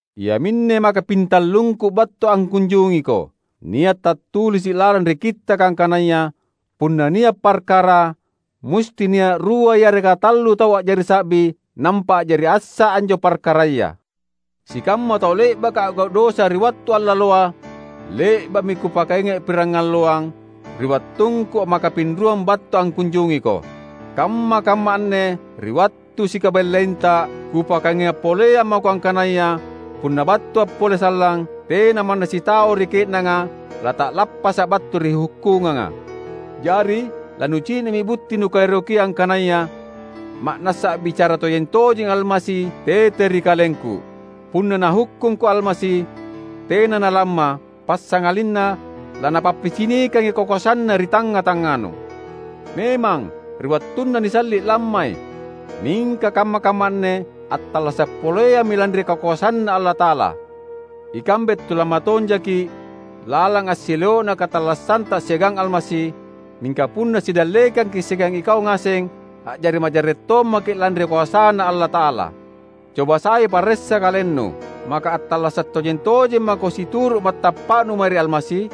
Iaminne makapintallungku battu angkunjungiko. Nia’ tattulisi’ lalang ri Kittaka angkanaya, "Punna nia’ parkara musti nia’ rua yareka tallu tau a’jari sa’bi nampa a’jari assa anjo parkaraya." Sikamma tau le’baka a’gau’ dosa ri wattu allaloa, le’ba’mi kupakainga’ pirangalloang, ri wattungku makapinruang battu angkunjungiko. Kamma-kamma anne, ri wattu sikabellainta, kupakainga’ poleang mako angkanaya punna battua’ pole sallang, tena manna sitau ri ke’nanga lata’lappasa’ battu ri hukkunganga. Jari lanucini’mi butti nukaerokia angkanaya ma’nassa a’bicara tojeng-tojengi Almasi tete ri kalengku. Punna Nahukkungko Almasi, tena nalamma, passangalinna laNapappicinikangi kakoasanNa ri tangnga-tangnganu. Memang, ri wattunna nisalli’ lammai; mingka kamma-kamma anne attallasa’ poleammi lanri kakoasanNa Allata’ala. Ikambe tulamma tonjaki’ lalang assileo’na katallassanta siagang Almasi; mingka punna sidallekangki’ siagang ikau ngaseng, a’jari majarre’ tommaki’ lanri koasaNa Allata’ala. Coba sai paressa kalennu, maka attallasa’ tojeng-tojeng mako situru’ matappa’nu mae ri Almasi?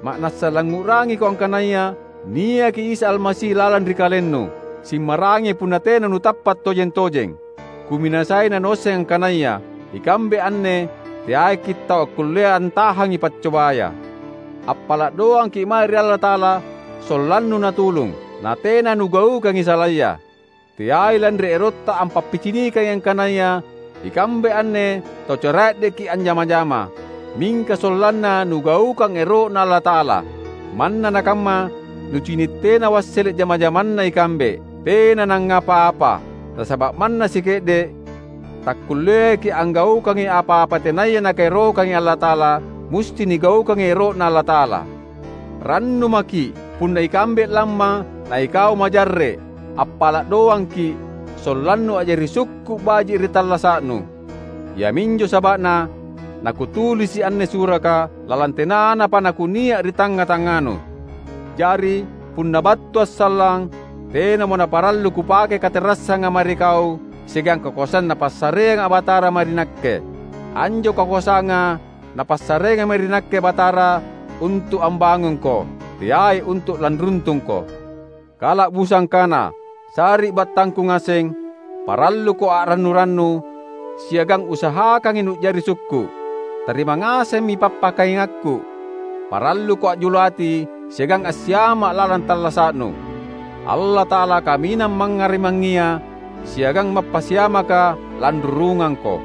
Ma’nassa langngu’rangiko angkanaya niaki Isa Almasi lalang ri kalennu! Simmaraengi punna tena nutappa’ tojeng-tojeng. Kuminasai nanuasseng angkanaya ikambe anne teaiki’ tau akkullea antahangi paccobaya. Appala’ doangki’ mae ri Allata’ala sollannu Natulung, natena nugaukangi salaya. Teai lanri erotta ampappicinikangi angkanaya ikambe anne tau cara’dekki’ anjama-jama. Mingka sollanna nugaukang ero’Na Allata’ala — manna nakamma nucini’ tena wassele’ jama-jamanna ikambe. Tena nangngapa-apa! Nasaba’ manna sike’de’, takkulleaki’ anggaukangi apa-apa tenaya Nakaerokangi Allata’ala; musti nigaukangi ero’Na Allata’ala. Rannu maki’, punna ikambe lamma na ikau majarre’. Appala’ doangki’, sollannu a’jari sukku’ baji’ ri tallasa’nu. Iaminjo saba’na nakutulisi’ anne suraka, lalang tenanapa nakunia’ ri tangnga-tangnganu. Jari, punna battua’ sallang, tenamo naparallu kupake katerassanga mae ri kau siagang kakoasang Napassareanga Batarata mae ri nakke. Anjo kakoasanga Napassareangi mae ri nakke Batara untu’ ambangungko. Teai untu’ lanruntungko. Kala’busang kana, sari’battangku ngaseng, paralluko a’rannu-rannu, siagang usahakangi nu’jari sukku’. Tarima ngasemmi pappakaingakku. Paralluko a’julu ati siagang assiama’ lalang tallasa’nu. Allata’ala Kaminang Mangngarimangngia siagang mappasiamaka lanrurungangko.